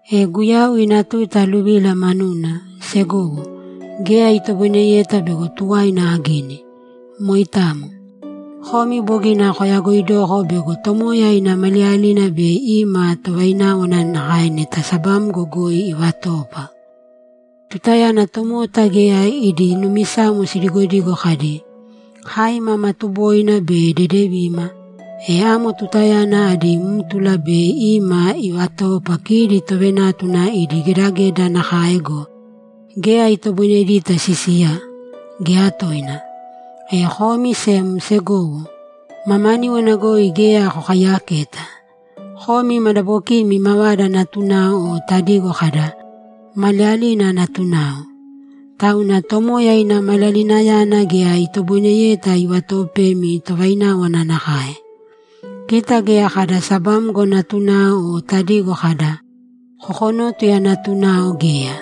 E Guyau ina tuta aluvila manuna, segowo, geya itoboineyeta bego tuwaina agini. Moitamo. Komi bogina koyagoidoko bego Tomoya ina Maliyalina bei ima tovaináwana nakae neta sabamgo goi ivatoopa. Tutayana tomota geya idi numisamo sidigodigo kadi, ‘Kai mama tuboina be dedevima’, e amo tutayana adí mtula bei ima ivatoopa kidi tovenátuna idi gedageda nakae go, geya itoboinedita sisiya, geya toina. E komi sem, segowo, mamaníwana goi geya kokaiyaketa; komi madabokiimi mavada natunao o tadigo kada, ‘Maliyalina natunao.’ Tauna Tomoya ina Maliyalinayana geya itoboineyeta ivatoopemi tovaináwana nakae. Kita geya kada sabamgo natunao o tadigo kada, ‘Kokonótuya natunao’, geya.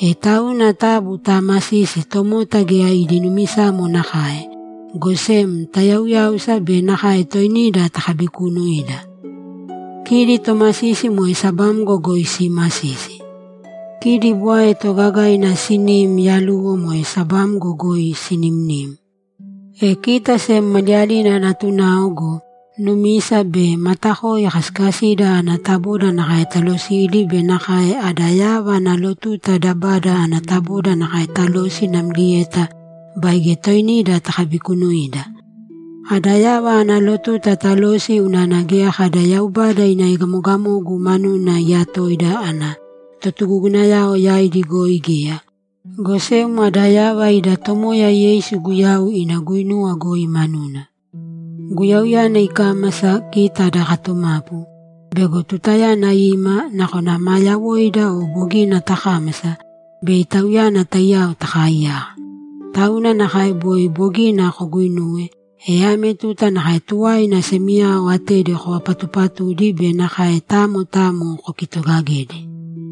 E tauna taabu taamasīsi tomota geya idi numisamo nakae, go sem tayauyāusa be nakae toinida takabikuunuīda. Kidi tomasisi moe sabamgo goi siimasisi. Kidi bwae toogagaina siniim yaluwo moe sabamgo goi sinimnim. E kita sem maliyalina natunao go, numisa be matakoi kasikasida ana taboda nakae talosīdi be nakae ada yava ana lotuta dabada ana taboda nakae talōsi namlieta baige toinida takabikuunuīda. Ada yava ana lotuta talōsi unana geya kada Yaubada ina egamogamogu manuna iyatoida ana totugugunayao yaidi goi geya, go sem ada yava ida Tomoya Yeisu Guyau ina guinuwa goi manuna. Guyauyana ikámasa, kita ada katumapu, bego tutayana ima, nakona maa yawoida o bogina takámasa, bei Tauyana taiyao takaaiyaka. Tauna nakae boi bogina koguuinuwe, e ame tuta nakae tuwaina semiyao atedi kovapatuupatūdi be nakae tamo tamo kokitoogagēdi.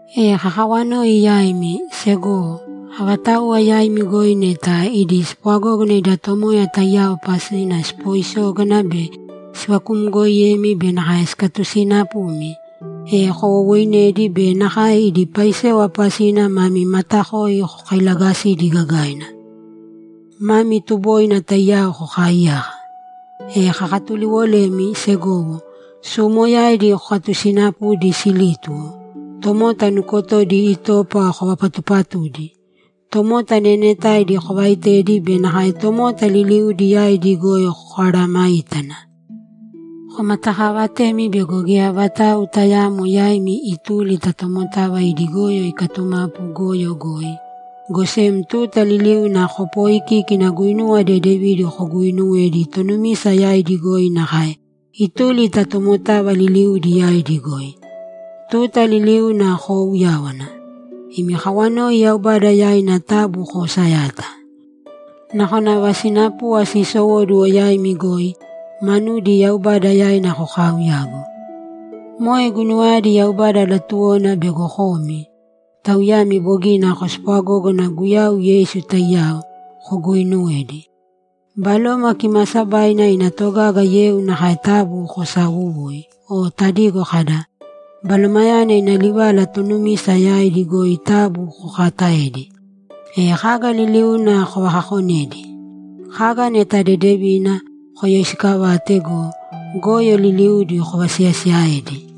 E kakawanoi yaimi, segowo, avatauwa yaimi goi neta idi spwagógana ida Tomoya taiyao pasina sipooisógana be sivakumgooiyemi be nakae sikatusiinapumi, e kowowooinēdi be nakae idi paisewa pasina mami matakoi kokailaagasīdi gagaina. Mami tuboina taiyao kokaaiyāka. E kakatuliwolemi, segowo, suumoyaidi kokatusiinapūdi silítuwo, tomota nukotodi itopa kovapatuupatūdi, tomota neenetaidi kovaaitēdi be nakae tomota liliudi yaidi goi koaaramāitana. Komatakaavatēmi bego geya vatau tayaamo yaimi ituli ta tomotava idi goyo ikatumapu goyo goi, go sem tuta liliuna kopooikīkina guinuwa dedevidi koguuinuwedi tonumisa yaidi goi nakae ituli ta tomotava liliudi yaidi goi. Tuta liliuna koouyāwana. Imi kawanoi Yaubada yaina taabu koosayāta. Nakona ava sinapuva siisowóduwo yaimi goi, manudi Yaubada yaina kokaauyāgu. Moe guinuwayadi Yaubada latuwona bego komi, tauyami bogina kospwagógana Guyau Yeisu taiyao, koguuinuwedi. Baloma Kimaasabaina ina togaga yeu nakae taabu kosaawuwūi o tadigo kada, ‘Balomayana ina livala tonumisa yaidi goi taabu kokaataēdi.’ E kaga liliuna kovakakonēdi. Kaga neta dedevina, koyoisiikavāte go, goyo liliudi kovasiyasiiyaēdi.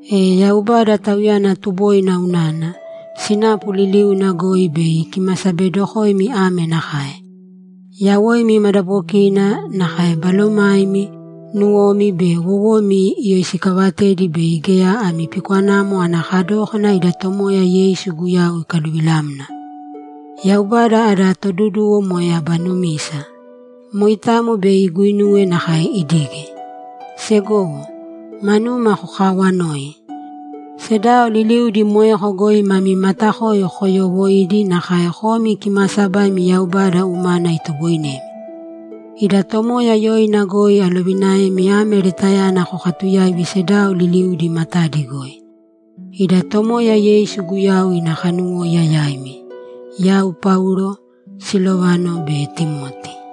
E Yaubada, Tauyana tuboina unana, sinapu liliuna goi bei ikimasabedokoimi ame nakae: Yawoimi madabokina, nakae balomaimi, nuwomi be wowomi, iyoisikavatedi bei geya ami pikwanamo ana kadókana ida Tomoya Yeisu Guyau ikaluvilamna. Yaubada ada Toduduwo moe aba numisa; moitamo bei iguinuwe nakae idige. Segowo, manuma kokaawanōi. Sedao liliudi moeko goi mami matakoi koyoowoiīdi nakae komi kimaasabaimi Yaubada umana itoboinemi. Ida Tomoya yoina goi alovinaemi ame letayana kokatuyāivi sedao liliudi matadi goi. Ida Tomoya Yeisu Guyau ina kanuwóiya yaimi! Yau Paulo, Silovano be Timoti